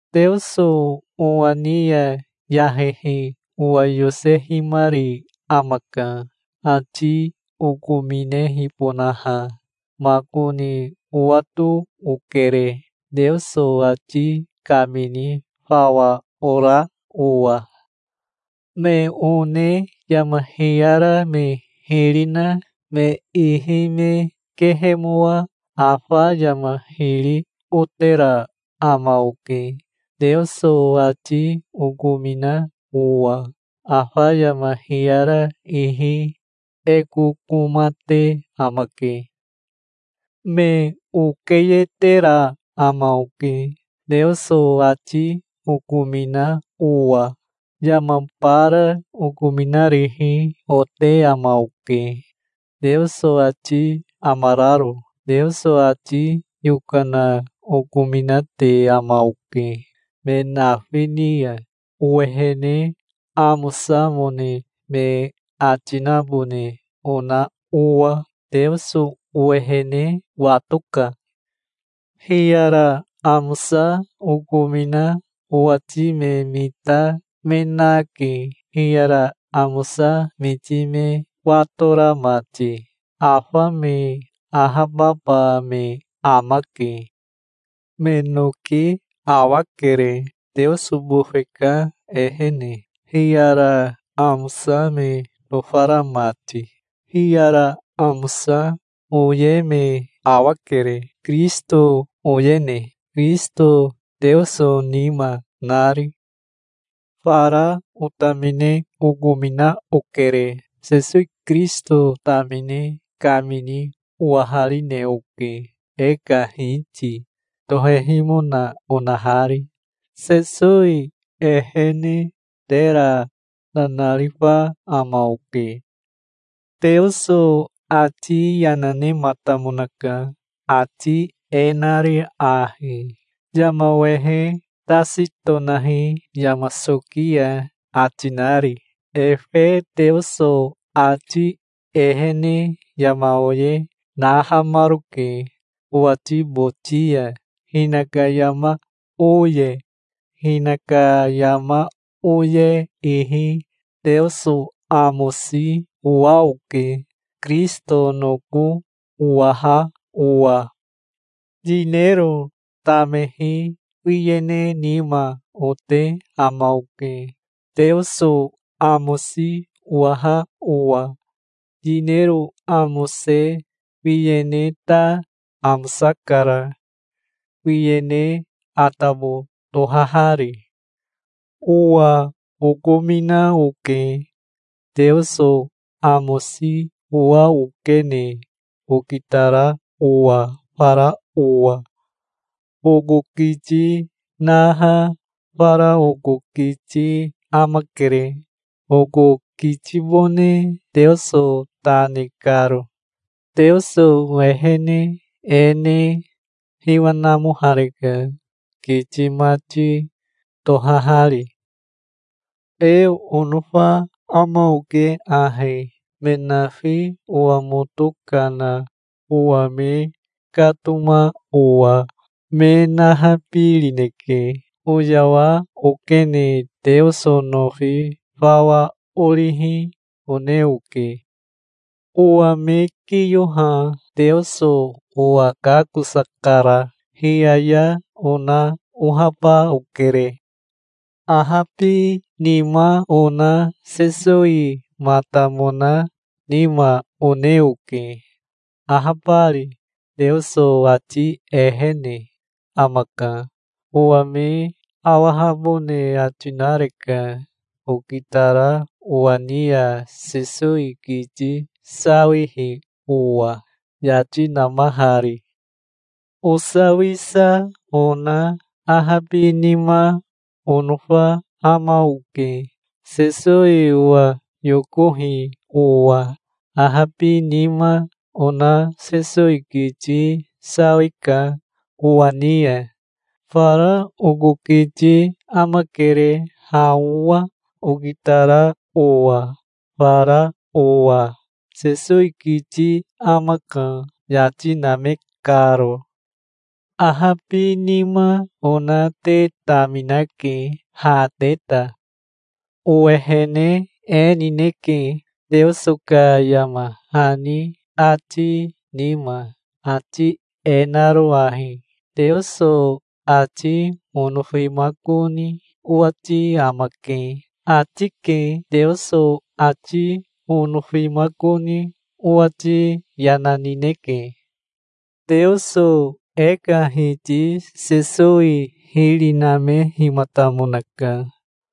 Teoso owa ni ya yahehi owa yosehimari amaka, ati okominehibonaha. Makoni owato okere, Teoso ati kamini fawa ora owa. Me one yama hiyara me hiri na me ihi me kehemoa afa yama hiri otera ama oke, Teoso ati okomina owa. Afa yama hiyara ihi e kokoma te amake. Me okeyetera ama oke, Teoso ati okomina owa. Yama bara okominarihi ote ama oke, Teoso ati amararo. Teoso ati yokana okominate ama oke, me nafi ni ya, owehene amosamone me ati nabone ona owa. Teoso owehene watoka. Hiyara amosa okomina owati me mita me nake, hiyara amosa miti me watora mati. Afa me ahababa me amake. Me noki awakere, teoso bofe ka ehene, hiyara amosa me nofara mati. Hiyara amosa oye me awakere, Kirisito oyene, Kirisito Teoso nima nari. Fara otamine okomina okere. Sesowi Kirisito tamine kamini owaharine oke, e ka Hiti tohehimona onahari. Sesowi ehene tera nanarifa ama oke. Teoso ati yana nematamonaka ati e nari ahi, "Yama wehe tasi tonahi yama soki ya", ati nari. Efe Teoso ati ehene yama oye nahamaroke owati boti ya, hinaka yama oye. Hinaka yama oye ihi Teoso amosi owa oke, Kirisito noko owaha owa. Yinero tamehi wiyene nima ote ama oke, Teoso amosi owaha owa. Yinero amose wiyene ta amosakara, wiyene atabo tohahari. Owa okomina oke, Teoso amosi owa okene okitara owa fara owa. Oko kiti naha fara oko kiti amakere, oko kitibone Teoso ta ne karo. Teoso ehene e ne hiwa namohareka, kiti mati tohahari. E onofa ama oke ahi: me nafi owa moto kana owa me katoma owa me nahabirineke. Oyawa okene Teoso nofi fawa orihi one oke. Owa me kiyoha Teoso owa kakosakara. Hiyaya ona ohaba okere. Ahabinima ona Sesowimatamona nima one oke, ahabari. Teoso ati ehene amaka. Owa me awahabone ati nareka, okitara owa ni ya Sesowi kiti sawihi owa, yati namahari. Osawisa ona ahabinima onofa ama oke, Sesowi owa yokohi owa. Ahabinima ona Sesowi kiti sawika owa ni ya. Fara oko kiti amakere ha owa, okitara owa fara owa. Sesowi kiti amaka, yati name karo. Ahabinima ona te taminake, ha te ta. Owehene e nineke, Teoso ka yama hani ati nima, ati e naro ahi: "Teoso ati onofimakoni owati amake", ati ke. Teoso ati onofimakoni owati yana nineke. Teoso e ka Hiti Sesowi hiri namehimatamonaka.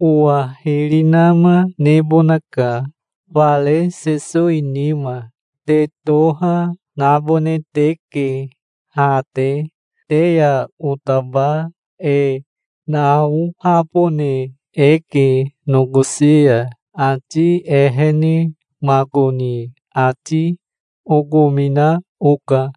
Owa hiri nama nebonaka, fare Sesowi nima. Te toha, nabone teke ha te. Te ya otaba e naohabone eke nokosi ya, ati ehene. Makoni ati okomina oka.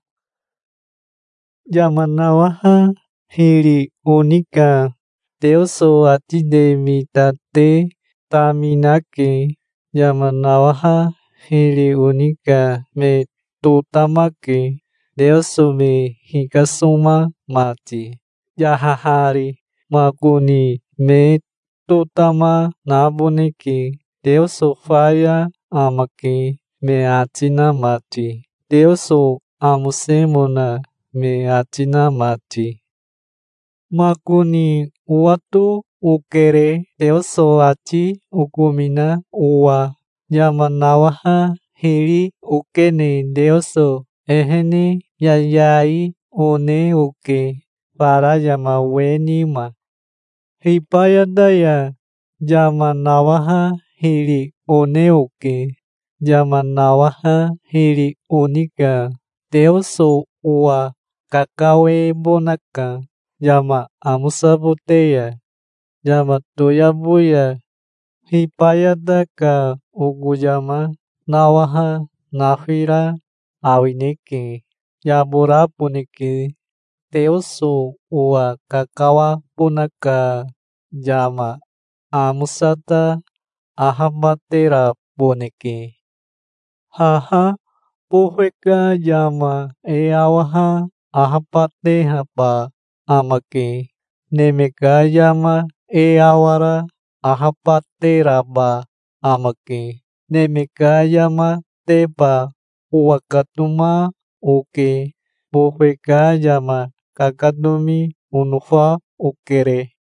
Yama nawaha hiri oni ka Teoso ati te mita te taminake. Yama nawaha hiri oni ka me totamake Teoso me hikasoma mati, yahahari. Makoni me totama naboneke, "Teoso faya amake", me ati na mati, Teoso amosemona me ati na mati. Makoni owato okere, Teoso ati okomina owa. Yama nawaha hiri okene Teoso ehene yayai one oke, fara yama we nima. Hibayata ya yama nawaha hiri one oke. Yama nawaha hiri oni ka Teoso owa kakawebonaka yama amosabote ya, yama toyabo ya. Hibayata ka oko yama nawaha nafira awineke. Yaboraboneke. Teoso owa kakawabona ka yama amosa ta ahabateraboneke. Haha bofe ka yama e awaha ahabatehaba amake. Neme ka yama e awara ahabateraba amake. Neme ka yamateba owakatoma oke. Bofe ka yama kakatomi onofa okere.